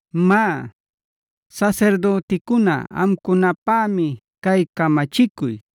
“Má, sasirdüticuna amcunapämi cay camachicuy: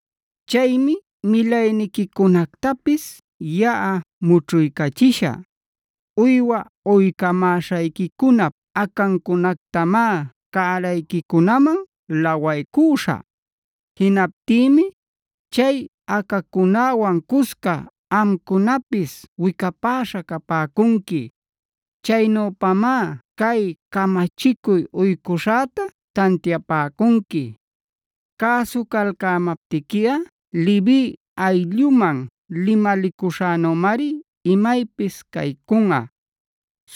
“Chaymi milayniquicunactapis yaꞌa mućhuycachishä. Uywa uycamäśhayquicunap acancunactamá cärayquicunaman lawaycüśhä. Jinaptïmi ¡chay acacunäwan cusca amcunapis wicapäśha capäcunqui! Chaynüpamá cay camachicuy uycuśhäta tantiapäcunqui. Cäsucalcämaptiquiꞌa Levia aylluman limalicuśhänümari imaypis caycunꞌa.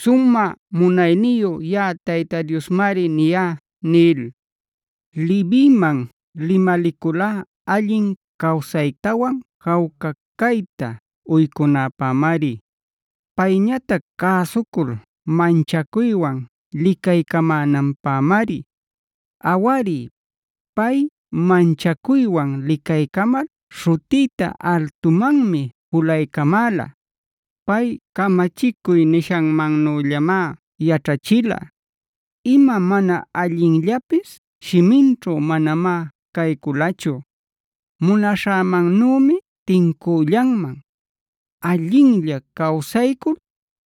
Sumä munayniyu yaꞌa Tayta Diosmari niyá” nil. “Leviman limaliculá allin cawsaytawan jawca cayta uycunäpämari.b Payñatac cäsucul manchacuywan licaycamänanpämari. Awari, pay manchacuywan licaycamal śhutïta altumanmi julaycamäla. Pay camachicuy nishanmannüllamá yaćhachila; ima mana allinllapis shiminćhu manamá cayculachu. Munaśhämannümi tincüllanman, allinlla cawsaycul,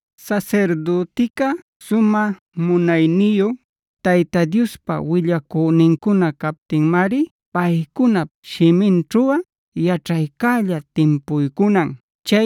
Sasirdütica sumä munayniyu Tayta Diospa willacünincuna captinmari paycunap shiminćhuꞌa yaćhaycälla timpuycunan.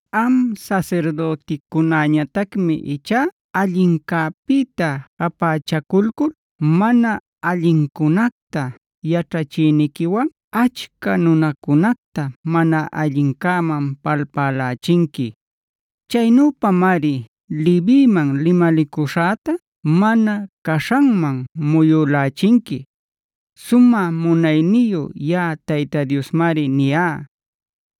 “Am sasirdüticunäñatacmi ichá allincäpïta japächaculcul mana allincunacta yaćhachiyniquiwan achca nunacunacta mana allincäman palpälächinqui. Chaynüpamari Leviman limalicuśhäta mana caśhanman muyülächinqui. Sumä munayniyu yaꞌa Tayta Diosmari niyá.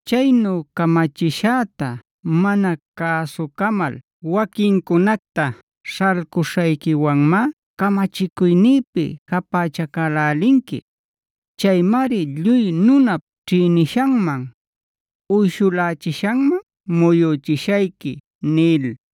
Chaynu camachishäta mana cäsucamal waquincunacta śhalcuśhayquiwanmá camachicuynïpi japächacälälinqui. Chaymari lluy nunap ćhïnishaman, uyshulächishaman muyüchishayqui” nil.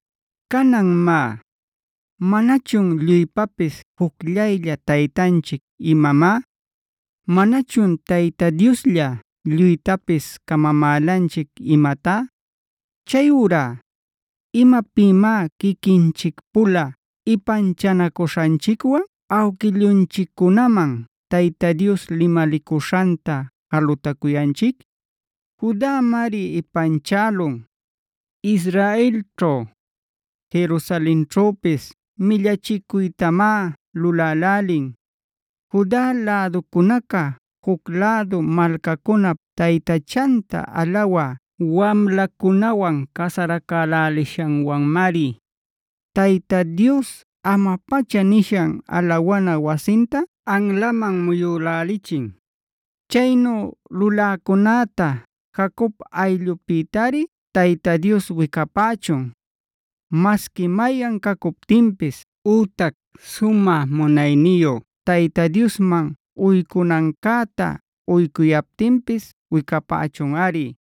Canan má, ¿manachun lluypapis jucllaylla Taytanchic imamá? ¿Manachun Tayta Dioslla lluytapis camamälanchic imatá?e Chayurá ¿imapïmá quiquinchic-pula ipanchanacuśhanchicwan awquillunchiccunaman Tayta Dios limalicuśhanta jalutacuyanchic? Judamari ipanchälun; Israelćhu, Jerusalenćhüpis millachicuytamá lulälälin. Juda läducunaca juc lädu malcacunap taytachanta alawä wamlacunawan casaracälälishanwanmari, Tayta Dios ama-pacha nishan alawana wasinta anlaman muyülälichin. Chaynu luläcunäta Jacob ayllupïtari Tayta Dios wicapächun; masqui mayan cacuptinpis ütac sumä munayniyu Tayta Diosman uycunancäta uycuyaptinpis wicapächunꞌari.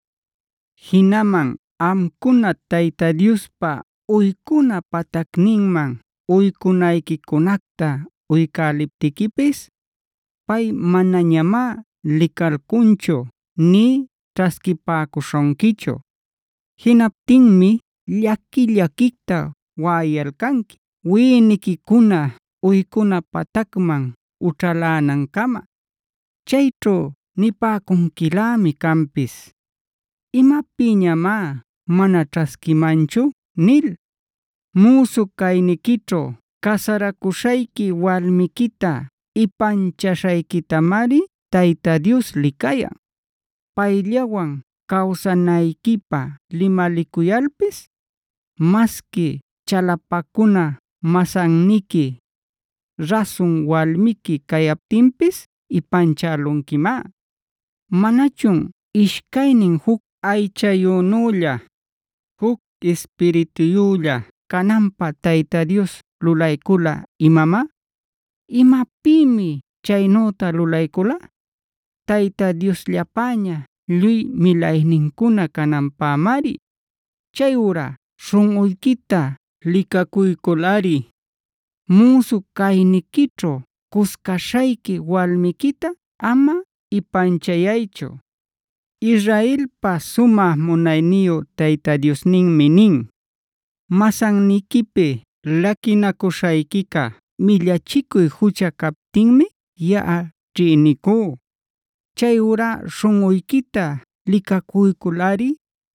Jinaman amcuna Tayta Diospa uycuna patacninman uycunayquicunacta uycäliptiquipis, pay manañamá licalcunchu nï ćhasquipäcuśhunquichu. Jinaptinmi llaqui-llaquicta waꞌayalcanqui wiꞌiniquicuna uycuna patacman ućhalänancama. Chayćhu nipäcunquilämi canpis: “¿Imapïñamá mana ćhasquimanchu?” nil. Müsu cayniquićhu casaracuśhayqui walmiquita ipanchaśhayquitamari Tayta Dios licayan. Payllawan cawsanayquipä limalicuyalpis, masqui chalapacuna masanniqui, rasun walmiqui cayaptinpis ipanchälunquimá. ¿Manachun ishcaynin juc aychayünülla, juc ispirituyülla cananpä Tayta Dios lulaycula imamá? ¿Imapïmi chaynüta lulaycula? Tayta Diosllapäña lluy milaynincuna cananpämari. Chayurá śhunꞌuyquita licacuyculꞌari, müsu cayniquićhu cuscaśhayqui walmiquita ama ipanchayaychu. Israelpa sumä munayniyu Tayta Diosninmi nin: “Masanniquipi laquinacuśhayquica millachicuy jucha captinmi yaꞌa ćhïnicú. Chayurá śhunꞌuyquita licacuyculꞌari,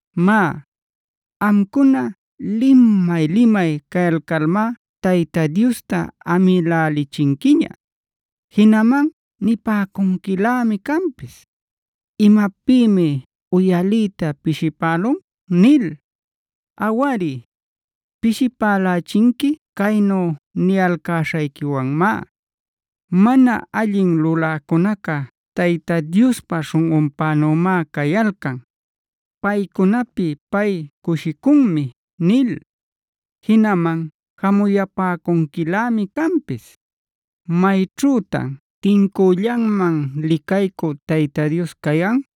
Má, amcuna limay-limay cayalcalmá Tayta Diosta amïlälichinquiña. Jinaman nipäcunquilämi canpis: “¿Imapïmi uyaliyta pishipälun?” nil. Awari, pishipälächinqui caynu niyalcäśhayquiwanmá: “Mana allin luläcunaca Tayta Diospa śhunꞌunpänümá cayalcan; paycunapi pay cushicunmi” nil. Jinaman jamuyapäcunquilämi canpis: “¿Mayćhütan tincüllanman licaycü Tayta Dios cayan?”